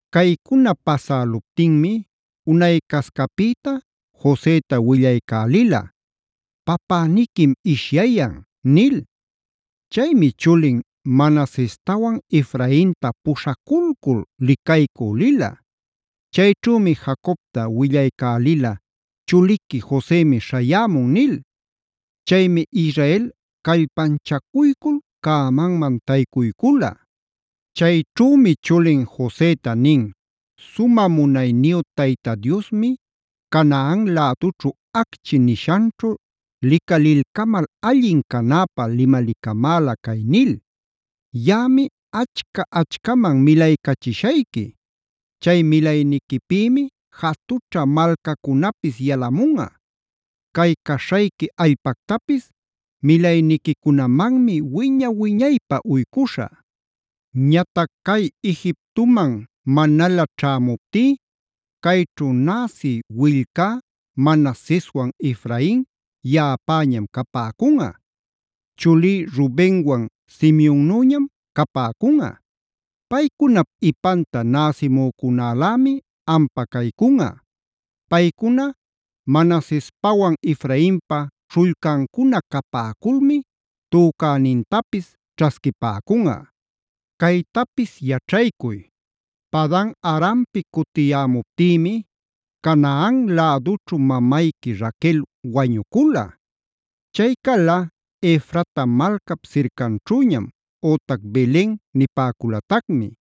Caycuna pasäluptinmi unaycascapïta Joseta willaycälila: “Papäniquim ishyayan” nil. Chaymi chulin Manasestawan, Efrainta puśhaculcul licaycü lila. Chayćhümi Jacobta willaycälila “Chuliqui Josemi śhayämun” nil. Chaymi Israel callpanchacuycul cämanman taycuycula. Chayćhümi chulin Joseta nin: “Sumä munayniyu Tayta Diosmi Canaan lädućhu acchi nishanćhu licalilcamal allin canäpä limalicamäla cay nil: ‘Yaꞌami achca-achcaman milaycachishayqui. Chay milayniquipïmi jatućha malcacunapis yalamunꞌa.a Cay caśhayqui allpactapis milayniquicunamanmi wiña-wiñaypä uycuśhä’. Ñatac cay Egiptoman manalä ćhämuptí cayćhu näsi willcá Manaseswan Efrain yaꞌapäñam capäcunꞌa. Chulí Rubenwan Simeonnüñam capäcunꞌa. Paycunap ipanta näsimücunälämi ampä caycunꞌa. Paycuna Manasespawan Efrainpa śhullcancuna capäculmi tücänintapis ćhasquipäcunꞌa. Caytapis yaćhaycuy: Padan-arampi cutiyämuptïmi Canaan lädućhu mamayqui Raquel wañucula. Chay cala Efrata malcap sircanćhüñam ütac Belen nipäculatacmi.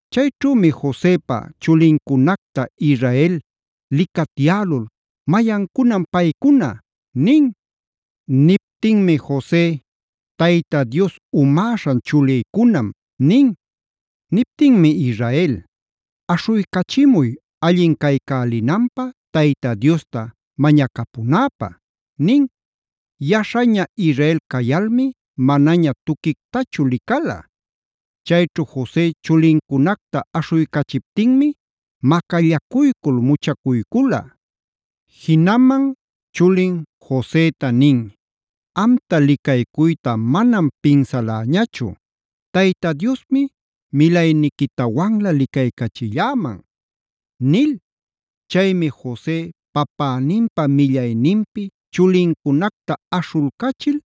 Chayćhümi Josepa chulincunacta Israel licatyälul: “¿Mayancunam paycuna?” nin. Niptinmi Jose: “Tayta Dios umäśhan chulïcunam” nin. Niptinmi Israel: “Aśhuycachimuy allin caycälinanpä Tayta Diosta mañacapunäpä” nin. Yaśhaña Israel cayalmi manaña tuquictachu licala. Chayćhu Jose chulincunacta aśhuycachiptinmi macallacuycul muchacuycula. Jinaman chulin Joseta nin: “Amta licaycuyta manam pinsaläñachu, Tayta Diosmi milayniquitawanlä licaycachilläman” nil. Chaymi Jose papäninpa millayninpi chulincunacta aśhulcachil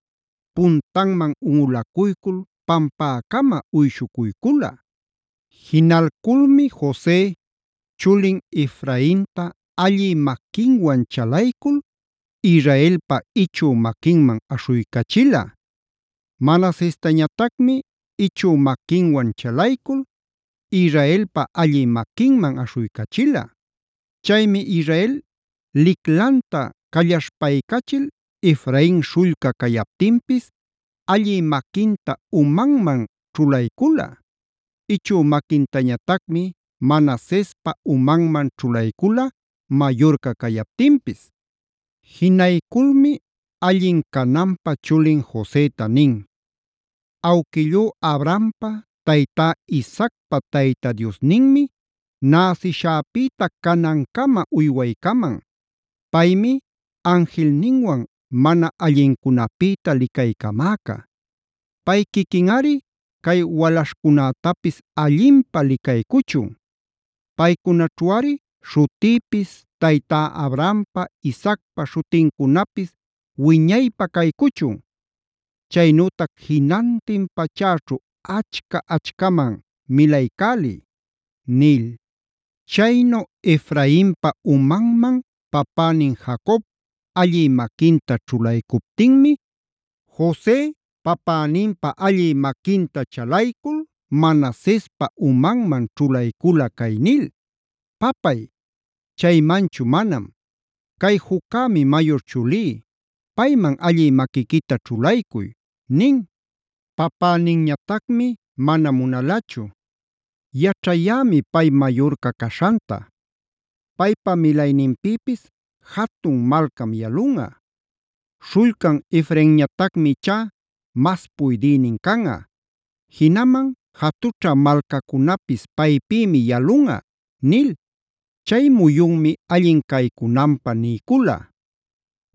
puntanman unꞌulacuycul pampäcama uyshucuycula. Jinalculmi Jose chulin Efrainta allï maquinwan chalaycul, Israelpa ichü maquinman aśhuycachila. Manasestañatacmi ichü maquinwan chalaycul, Israelpa allï maquinman aśhuycachila. Chaymi Israel liclanta callaśhpaycachil Efrain śhullca cayaptinpis allï maquinta umanman ćhulaycula. Ichü maquintañatacmi Manasespa umanman ćhulaycula mayurca cayaptinpis. Jinayculmi allin cananpä chulin Joseta nin: “Awquillú Abrahampa, taytá Isaacpa Tayta Diosninmi näsishäpïta canancama uywaycaman. Paymi anjilninwan mana allincunäpïta licaycamäca. Pay quiquinꞌari cay walaśhcunätapis allinpä licaycuchun. Paycunaćhuꞌari śhutïpis, taytá Abrahampa, Isaacpa śhutincunapis wiñaypä caycuchun. Chaynütac jinantin pachäćhu achca-achcaman milaycäliy” nil. Chaynu Efrainpa umanman papänin Jacob allï maquinta ćhulaycuptinmi Jose papäninpa allï maquinta chalaycul Manasespa umanman ćhulaycula cay nil: “Papay, chaymanchu manam. Cay juccämi mayur chulí; payman allï maquiquita ćhulaycuy” nin. Papäninñatacmi mana munalachu: “Yaćhayämi pay mayurca caśhanta; paypa milayninpïpis jatun malcam yalunꞌa. Śhullcan Efrainñatacmi ichá mas puydïnin canꞌa; jinaman jatućha malcacunapis paypïmi yalunꞌa” nil. Chay muyunmi allin caycunanpä niycula: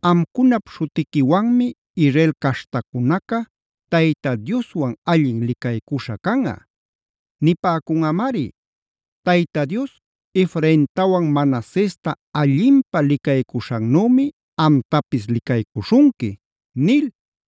“Amcunap śhutiquiwanmi Israel caśhtacunaca Tayta Dioswan allin licaycuśha canꞌa. Nipäcunꞌamari: ‘Tayta Dios Efraintawan Manasesta allinpä licaycuśhannümi amtapis licaycuśhunqui’” nil.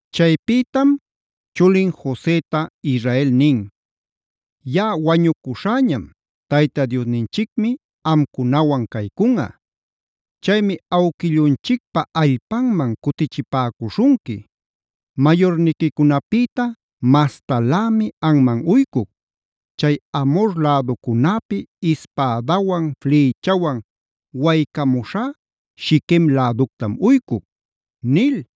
Chaypïtam chulin Joseta Israel nin: “Yaꞌa wañucuśhäñam, Tayta Diosninchicmi amcunawan caycunꞌa. Chaymi awquillunchicpa allpanman cutichipäcuśhunqui. Mayurniquicunapïta mastalämi anman uycuc: Chay Amhor läducunäpi ispädawan flïchawan waycamuśhá Shiquem läductam uycuc” nil.